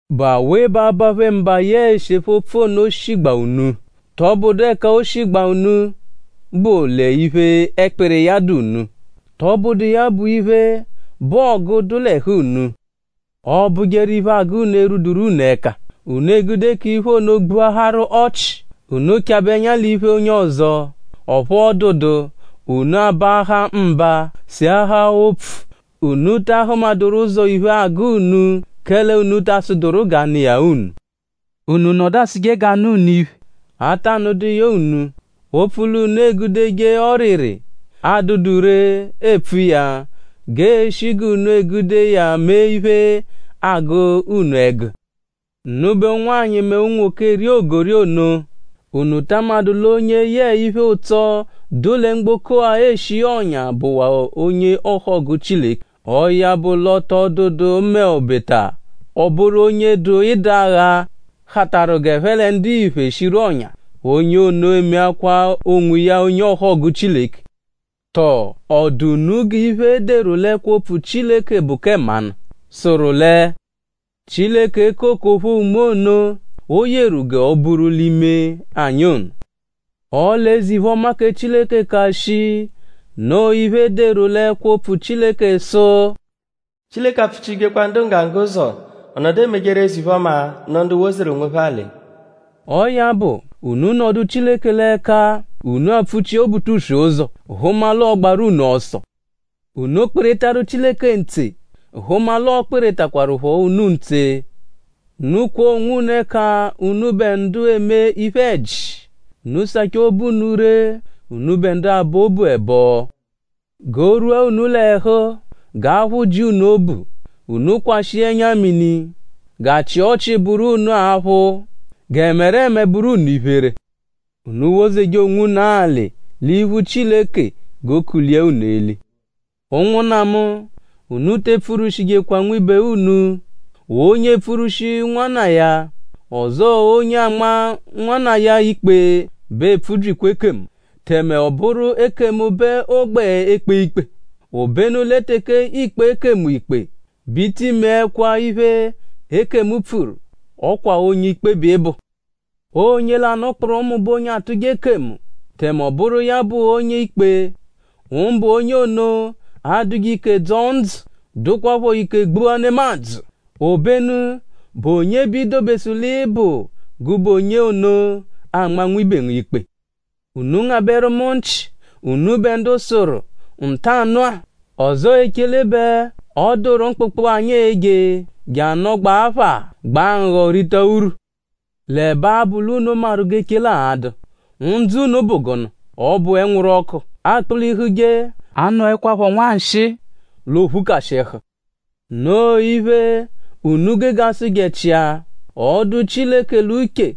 ?Bụ awe bẹ abaphe mba yẹe esephe opfu ono shigbaa unu??Tọbudu ẹka o shigbaa unu bụ l'iphe, ẹkpiri iya dụ unu??Tọbudu iya bụ iphe, bụ ọgu, dụ l'ẹhu unu? Ọobujeru iphe, agụ unu erwuduru unu ẹka; unu egude k'iphe ono gbuaharu ọchi. Unu -chabẹ ẹnya l'iphe onye ọzo; ọphu ọ dụdu; unu abaahaa mba; seahaa opfu. Unu ta ahụmaduru ụzo iphe, agụ unu; kẹle unu ta asụduru g'a nụ iya unu. Unu nọdu asụje g'a nụ unu iphe; a ta nụdu iya unu; opfu l'unu egudeje ọriri, adụdu ree epfu iya g'ee-shi g'unu egude iya mee iphe, agụ unu ẹgu. Unubẹ ụnwanyi mẹ unwoke, eri ogori ono;?unu ta amadụ l'onye yẹe iphe-ụtso, dụ lẹ mgboko-a eshi ọ̀nyà bụwaa onye ọhogu Chileke? Ọo ya bụ l'ọ tọ dụdu m'obeta ọ bụru onye dụ ịdagha hatarụ g'ẹphe lẹ ndiphe shiru ọ̀nyà; onye ono emekwa onwiya onye ọhogu Chileke. Tọ?ọ dụ unu g'iphe, e deru l'ẹkwo-opfu Chileke bụ kẹ mmanụ, sụru lẹ “Chileke eko okophoo unme ono, o yeru g'o buru l'ime anyi ono?” Ọle eze-iphe-ọma kẹ Chileke ka shii. Noo iphe, e deru l'ẹkwo-opfu Chileke sụ: “Chileke apfụchijekwa ndu nggangga ụzo. Ọ nọdu emejeru eze-iphe-ọma nụ ndu wozeru onwophẹ alị.” Ọo ya bụ; unu nọdu Chileke l'ẹka. Unu apfụ-chia Obutuswe ụzo; hụma l'ọo-gbaru unu ọso. Unu kpịritaru Chileke ntse; hụma l'ọo-kpịritakwarupho unu ntse. Unu kwọo onwunu ẹka unubẹ ndu eme iphe-ẹji. Unu sachaa obu unu ree unubẹ ndu abọ obu ẹbo. G'o rwua unu l'ẹhu; g'aphụ ji unu obu; unu kwashịa ẹnya-mini. G'achị ọchi bụru unu aphụ; g'ẹmereme bụru unu iphere. Unu wozeje onwunu alị l'iphu Chileke g'ookulia unu eli. Ụnwunna mu; unu te epfurwushijekwa nwibe unu. Onye epfurwushi nwanna iya; ọzoo onye anma nwanna iya ikpe bẹ epfubyikwa ekemu; tẹme ọ bụru ekemu bẹ ọ gbẹ ekpe ikpe. Obenu lẹ teke iikpe ekemu ikpe bẹ i ti meẹkwa iphe, ekemu pfuru. Ọ kwa onye-ikpe bẹ ị bụ. Onye lanụ kpụrumu bụ onye atụje ekemu; tẹme ọ bụru iya bụ onye-ikpe; mbụ onye ono, adụje ike dzọo ndzụ; dụkwapho ike gbua nemadzụ. Obenu?bụ onye b'i dobesu l'ị bụ gụbe onye ono, anma nwibe ngu ikpe? Unu ngabẹru mu nchị; unubẹ ndu sụru “Ntanụ-a; ọzoo echele bẹ ọ dụru mkpụkpu, anyi e-je je anọgba apha; gbaa nghọ rita urwu;” l'ẹbe abụ l'unu maru g'echele a-dụ.?Ndzụ unu bụ gụnu? Ọ bụ ẹnwuru-ọku, akpụ-lihuje; a nọekwapho nwanshịi l'oophukashịhu. Noo iphe, unu gege asụje-chia: “Ọ -dụ Chileke l'uche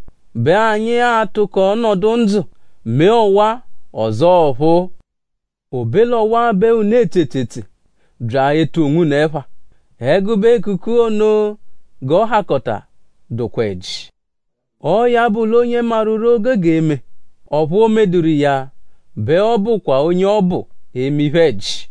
bẹ anyi a-tụko nọdu ndzụ; mee ọwa-a; ọzoo ọphuu.” Obe l'ọwa bẹ unu etse etsetse bya etu onwunu ẹpha. Ẹgube ekuku ono g'ọ hakọta dụkwa ẹji. Ọo ya bụ l'onye maru ree, o gege eme; ọphu o medụru iya bẹ ọ bụkwa onye ọbu eme iphe-ẹji.